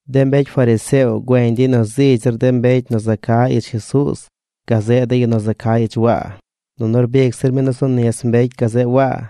De mbecy fariseo güeñ dey nu zigy zir de mbecy nu za ca ich Jesuuz, gazeꞌ de yu nu za ca ich Waa. Nunu rbic zir mi nu zu nis mbecy gazeꞌ Waa.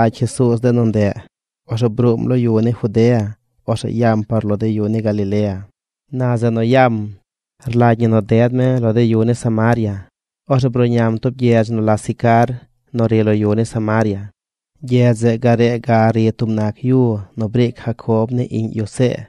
Na ornu gud lagy Jesuuz de nu ndeꞌ, orzeꞌ bruum lo yu ni Judea, orzeꞌ yam par de lo yu ni Galilea. Na zeꞌ nu yam rlagy ñi nu ded mi lo de yu ni Samaria. Orzeꞌ bruꞌñam tub gyedz nu la Sicar nu ri lo yu ni Samaria. Gyedz zeꞌ gare ga ri tub nac yu nu briic Jacob ni iꞌñ yu See.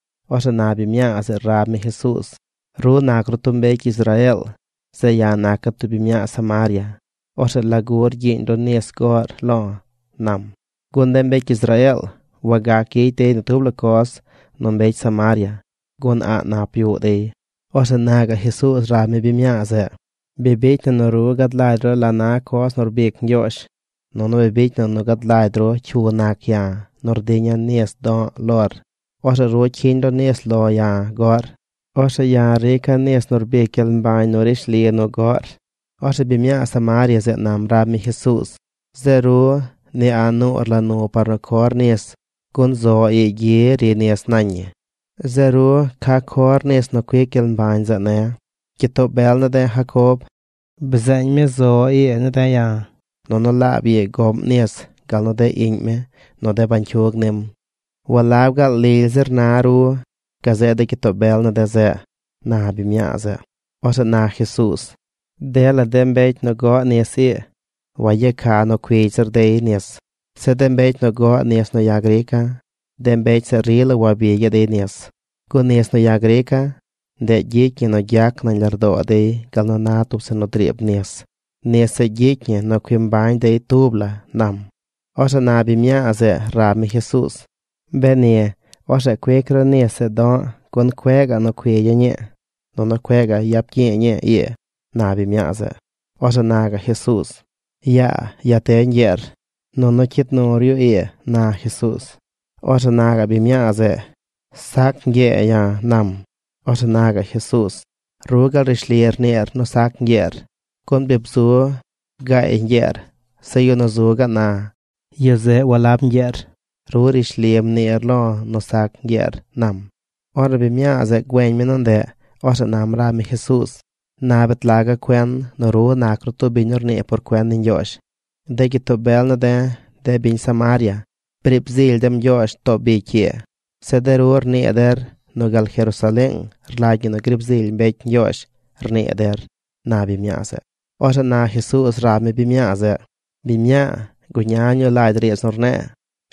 Orzeꞌ na biñ mñaa zeꞌ rab mi Jesuuz: ―Ru nac ru tub mbecy Israeel. Zeꞌ ya̱ naca̱ tub biñ mñaa Samaria. Orzeꞌ ¿lagu rgyiiñ ru nis goꞌr lo̱? ―nam. Gun de mbecy Israeel wagac gyicy dey ni tub la coz nu mbecy Samaria, gun a̱ꞌ nap yuꞌ dey. Orzeꞌ na gaꞌ Jesuuz rab mi biñ mñaa zeꞌ: ―Bi bicy na nu ru gad lagy ru la na coz nu rbic Ñgyoozh, nunu bicy na nu gad lagy ru cyu nac ya̱, nu rdiña̱ nis do̱ꞌ lor, orzeꞌ ru cyiñ ru nis lo̱ ya̱ goꞌr. Orzeꞌ ya̱ rica̱ nis nu rbic gyel mbañ nu rishli nu goꞌr. Orzeꞌ biñ mñaa Samaria zeꞌ nam rab mi Jesuuz: ―Zeꞌ ru, ni a̱ꞌ nur la nu par nu cor nis, gun zo ii gyi ri nis nañ ñi. Zeꞌ ru, ¿ca cor nis nu cuic gyel mbañ zeꞌ ne̱? Gyitoo bel ne̱ de̱ Jacob bzeeñ mi zo ii ne̱ de̱ ya̱. Nunu laab ii goꞌm nis gal nu de iꞌñ mi nu de bañcyug nim. ¿Walab gaal lily zir na ru gazeꞌ gyitoo bel ne̱ de̱ zeꞌ? ―na biñ mñaa zeꞌ. Orzeꞌ na Jesuuz: ―Dela de mbecy nu goꞌ nis ii, wayeca nu cuigy zir dey nis. Zeꞌ de mbecy nu goꞌ nis nu ya̱ grica̱, de mbecy zeꞌ rila wabigyaꞌ dey nis. Gun nis nu ya̱ grica̱, ndeꞌ gyicy ñi nu gyac nañ lardoo dey gal na tub zeꞌ nu driib nis. Nis zeꞌ gyicy ñi nu cui mbañ dey tub la ―nam. Orzeꞌ na biñ mñaa zeꞌ rab mi Jesuuz: ―Beni, orzeꞌ cuic ru nis zeꞌ do̱ꞌ gun cueꞌ gaꞌ nu cuigya̱ꞌ ñii nunu cueꞌ gaꞌ gyap gyi̱i̱ ñii ii ―na biñ mñaa zeꞌ. Orzeꞌ na gaꞌ Jesuuz: ―Yaa, ya te ñgyeer, nunu cyid nur yu ii ―na Jesuuz. Orzeꞌ na gaꞌ biñ mña̱a̱ zeꞌ: ―Sac ñgye̱e̱ ya̱ ―nam. Orzeꞌ na gaꞌ Jesuuz: ―Ru gaal rishli rniir nu sac ñgyeer, Gun bi bzu gaay ñgyeer. Zeꞌ yu nu zu gaꞌ na, yu zeꞌ walab ñgyeer. Ru rishli mniir lo̱ nu sac ñgyeer ―nam. Ornu biñ mñaa zeꞌ güeñ mi nu ndeꞌ, orzeꞌ nam rab mi Jesuuz: ―Na bet laga̱ cuen nu ru nac ru tub biñ nu rnii por cuen ni Ñgyoozh. De gyitoo bel ne̱ de̱, de biñ Samaria, briib zily dem Ñgyoozh too bicy ii. Zeꞌ de ru rnii der nu gal Jerusaleeng rlagy ñi nu riib zily mbecy Ñgyoozh, rnii der ―na biñ mñaa zeꞌ. Orzeꞌ na Jesuuz rab mi biñ mñaa zeꞌ: ―Biñ mñaa, guña ñuu lagy riidz nu rne̱e̱.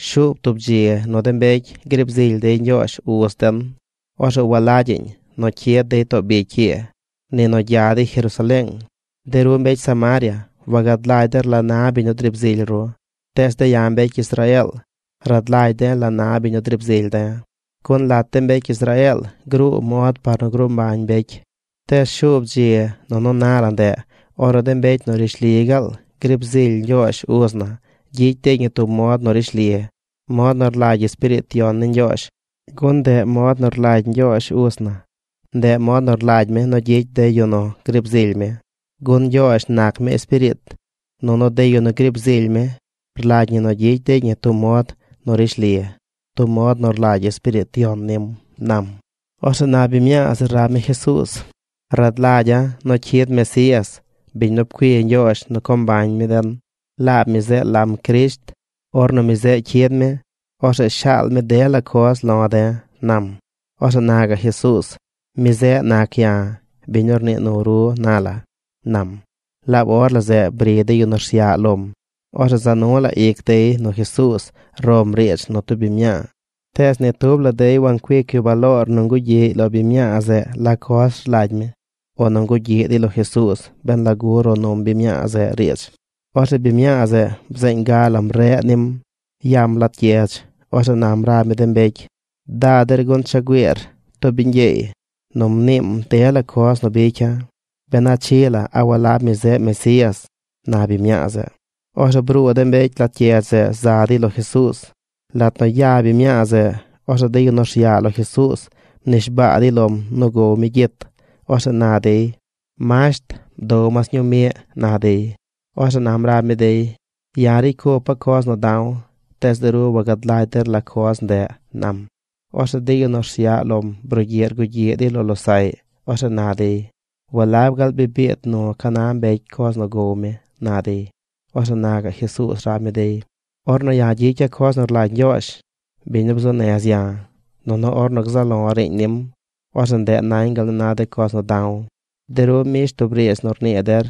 Shuub tub dzi nu de mbecy griib zily dey Ñgyoozh, uz den. Orzeꞌ walagyaꞌñ nu cyid dey too bicy ii, ni nu gya dey Jerusaleeng. De ru mbecy Samaria wagad lagy der la na biñ nu driib zily ru. Tees de̱ ya̱ mbecy Israeel rad lagy de̱ la na biñ nu driib zily de̱, gun lat de mbecy Israeel gruu mod par nu gruu mbañ mbecy. Tees shuub dzi, nunu na la ndeꞌ ornu de mbecy nu rishli gaal griib zily Ñgyoozh uz na gyicy dey ñi tub mod nu rishli, mod nu rlagy Espiriit Yon ni Ñgyoozh, gun ndeꞌ mod nu rlagy Ñgyoozh uz na. Ndeꞌ mod nu rlagy mi nu gyicy de yu nu griib zily mi. Gun Ñgyoozh nac mi Espiriit, nunu de yu nu griib zily mi rlagy ñi nu gyicy dey ñi tub mod nu rishli, tub mod nu rlagy Espiriit Yon nim ―nam. Orzeꞌ na biñ mñaa zeꞌ rab mi Jesuuz: ―Rad lagya̱ nu cyid Mesías, biñ nu pcui Ñgyoozh nu co mbañ mi den. Laab mi zeꞌ lam Crisht. Ornu mi zeꞌ cyid mi, orzeꞌ shaal mi dela coz lo̱ de̱ ―nam. Orzeꞌ na gaꞌ Jesuuz: ―Mi zeꞌ nac ya̱, biñ nu rnii nu ru na la ―nam. Laab or la zeꞌ bri de yu nu rsyaꞌ lom. Orzeꞌ za nu la ic dey nu Jesuuz rom riidz nu tub biñ mñaa. Tees ni tub la dey wancuic yu baloor nu ngugyiꞌy lo biñ mñaa zeꞌ la coz rlagy mi, o nu ngugyiꞌ dey lo Jesuuz ben lagu ro num biñ mñaa zeꞌ riidz. Orzeꞌ biñ mñaa zeꞌ bzeeñ ga lam reꞌ nim. Yam lat gyedz. Orzeꞌ nam rab mi de mbecy: ―Da der gun cha güiir tub biñ gyeey nu mniim dela coz nu bicya̱. ¿Ben a chii la a walab mi zeꞌ Mesías? ―na biñ mñaa zeꞌ. Orzeꞌ bruu de mbecy lat gyedz zeꞌ za dey lo Jesuuz. Lat nu ya biñ mñaa zeꞌ, orzeꞌ de yu nu rsyaꞌ lo Jesuuz rnishbaa dey lom nu gow mi gyit. Orzeꞌ na dey: ―Masht, bdow mas ñuu miꞌ ―na dey. Orzeꞌ nam rab mi dey: ―Ya̱ ricy cupa̱ coz nu da̱w. Tees de ru wagad lagy der la coz ndeꞌ ―nam. Orzeꞌ de yu nu rsyaꞌ lom brugyiꞌ rgugyiꞌ dey lo losaꞌy. Orzeꞌ na dey: ―¿Walab gaal bi biid nu ca na mbecy coz nu gow mi? ―na dey. Orzeꞌ na gaꞌ Jesuuz rab mi dey: ―Ornu gyicya̱ coz nu rlagy Ñgyoozh, biñ nu bzuu nez ya̱, nunu ornu gzaꞌ lo̱ riiñ nim, orzeꞌ ndeꞌ nañ gal na de coz nu da̱w. De ru mbish tub riidz nu rnii der: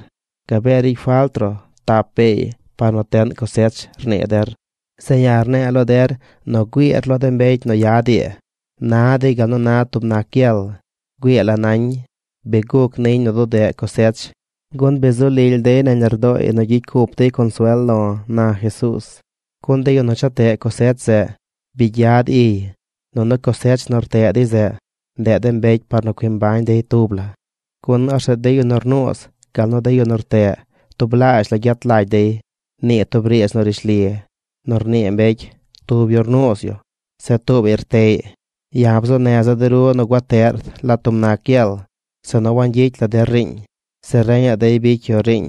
“Gabee ricy falt ruꞌ tap beey par nu teꞌn cosech”, rnii der. Zeꞌ ya̱ rne̱e̱ lo der nu güiir lo de mbecy nu yad ii. Na dey gal nu na tub nac gyel. Güii la nañ. Bi guc niñ nu dudeꞌ cosech, gun bi zu lily dey nañ lardooy nu gyicy cup dey consuel lo̱ ―na Jesuuz―. ’Gun de yu nu cha teꞌ cosech zeꞌ, bi gyad iy, nunu cosech nu rteꞌ dey zeꞌ, ndeꞌ de mbecy par nu cui mbañ dey tub la, gun orzeꞌ de yu nu rnuuz, gal nu de yu nu rteꞌ tublaazh la gyet lagy dey. Nii tub riidz nu rishli nu rnii mbecy: “Tub yu rnuuz yu. Zeꞌ tuubaꞌy rteꞌy.” Ya̱ bzuu neza̱ der nu gua teꞌr lat tub nac gyel zeꞌ nu wangyicy la der riiñ. Zeꞌ reñaꞌ dey bicy yu riiñ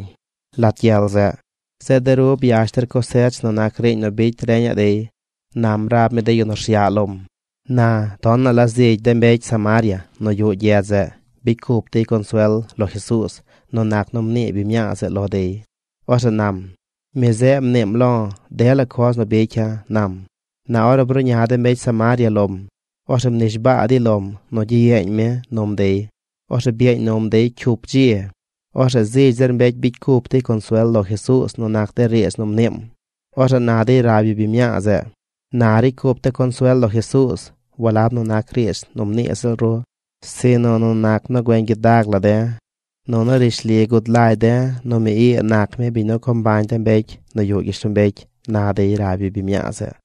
lat gyel zeꞌ. Zeꞌ de ru byash der cosech nu nac riiñ nu bicy reñaꞌ dey ―nam rab mi de yu nu rsyaꞌ lom. Na, tonaꞌ la zigy de mbecy Samaria nu yuꞌ gyedz zeꞌ bicy cup dey consuel lo Jesuuz nu nac nu mnii biñ mñaa zeꞌ lo dey. Orzeꞌ nam: “Mi zeꞌ mniim lo̱ dela coz nu bicya̱”, nam. Na ornu bruꞌña de mbecy Samaria lom, orzeꞌ mnishbaa dey lom nu gyiyeeñ mi num dey. Orzeꞌ byeeñ num dey cyup dzi. Orzeꞌ zigy zir mbecy bicy cup dey consuel lo Jesuuz nu nac de riidz nu mniim. Orzeꞌ na dey rab yu biñ mñaa zeꞌ: ―Na ricy cup de̱ consuel lo Jesuuz walab nu nac riidz nu mnii ziꞌl ru, sinu nu nac nu güeñ gyidag la de̱. Nunu rishli gud lagy de̱ nu mi ii nac mi biñ nu co mbañ de mbecy nu yuꞌ gyishlombecy ―na dey rab yu biñ mñaa zeꞌ.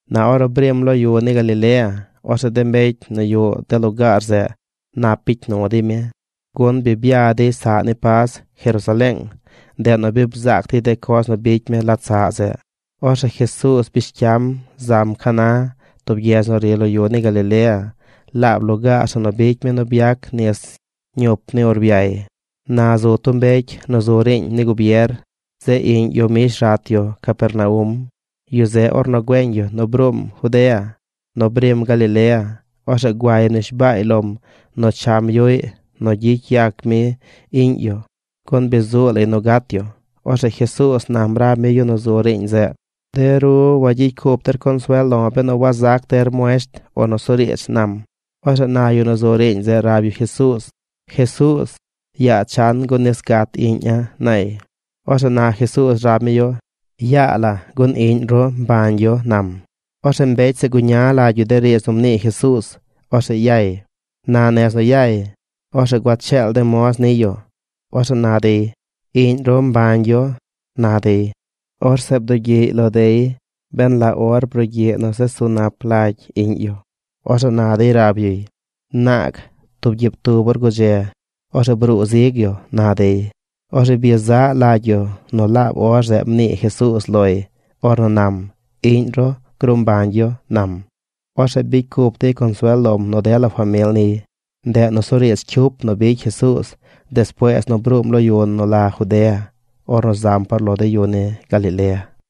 Na ornu brim lo de yu ni Galilea, orzeꞌ de mbecy nu yuꞌ de lugaar zeꞌ nap bicy nu dey mi, gun bi bya dey saꞌ ni Pas Jerusaleeng. Ndeꞌ bi bzaac dey de coz nu bicy mi lat saꞌ zeꞌ. Orzeꞌ Jesuuz bish cyam zam Caná, tub gyedz nu ri lo yu ni Galilea. Laab lugaar zeꞌ nu bicy mi nu byac nis ñup ni urbyay. Na zu tub mbecy nu zu riiñ ni gubier. Zeꞌ iꞌñ yu mbish rat yu Capernaum. Yu zeꞌ, ornu güeñ yu nu bruum Judea nu brim Galilea, orzeꞌ guay mnishbaay lom nu cham yuꞌy nu gyicy yac mi iꞌñ yu, gun bi zuu lay nu gat yu. Orzeꞌ Jesuuz nam rab mi yu nu zu riiñ zeꞌ: ―De ru wagyicy cup der consuel lo̱ benu wazac der muesht o nusuriidz ―nam. Orzeꞌ na yu nu zu riiñ zeꞌ rab yu Jesuuz: ―Jesuuz, yaa chan gun nis gat iꞌña̱ ―nay. Orzeꞌ na Jesuuz rab mi yu: ―Yaa la gun iꞌñ ru mbañ yu ―nam. Orzeꞌ mbecy zeꞌ guña lagy yu de riidz nu mnii Jesuuz. Orzeꞌ yay. Na nez nu yay, orzeꞌ gua cheel de moz niy yu. Orzeꞌ na dey: ―¡Iꞌñ ru mbañ yu! ―na dey. Orzeꞌ bdugyiꞌy lo dey ben la or brugyiꞌ nu zesu nap lagy iꞌñ yu. Orzeꞌ na dey rab yuy: ―Naag, tub gyiib tub or gudze, orzeꞌ bruu zig yu ―na dey. Orzeꞌ byezaꞌ lagy yu nu laab or zeꞌ mnii Jesuuz loy. Ornu nam: “Iꞌñ ru gruu mbañ yu”, nam. Orzeꞌ bicy cup dey consuel lom nu dela famil niy. Ndeꞌ nusuriidz cyup nu bicy Jesuuz despuees nu bruum lo yu nu la Judea ornu zam par lo de yu ni Galilea.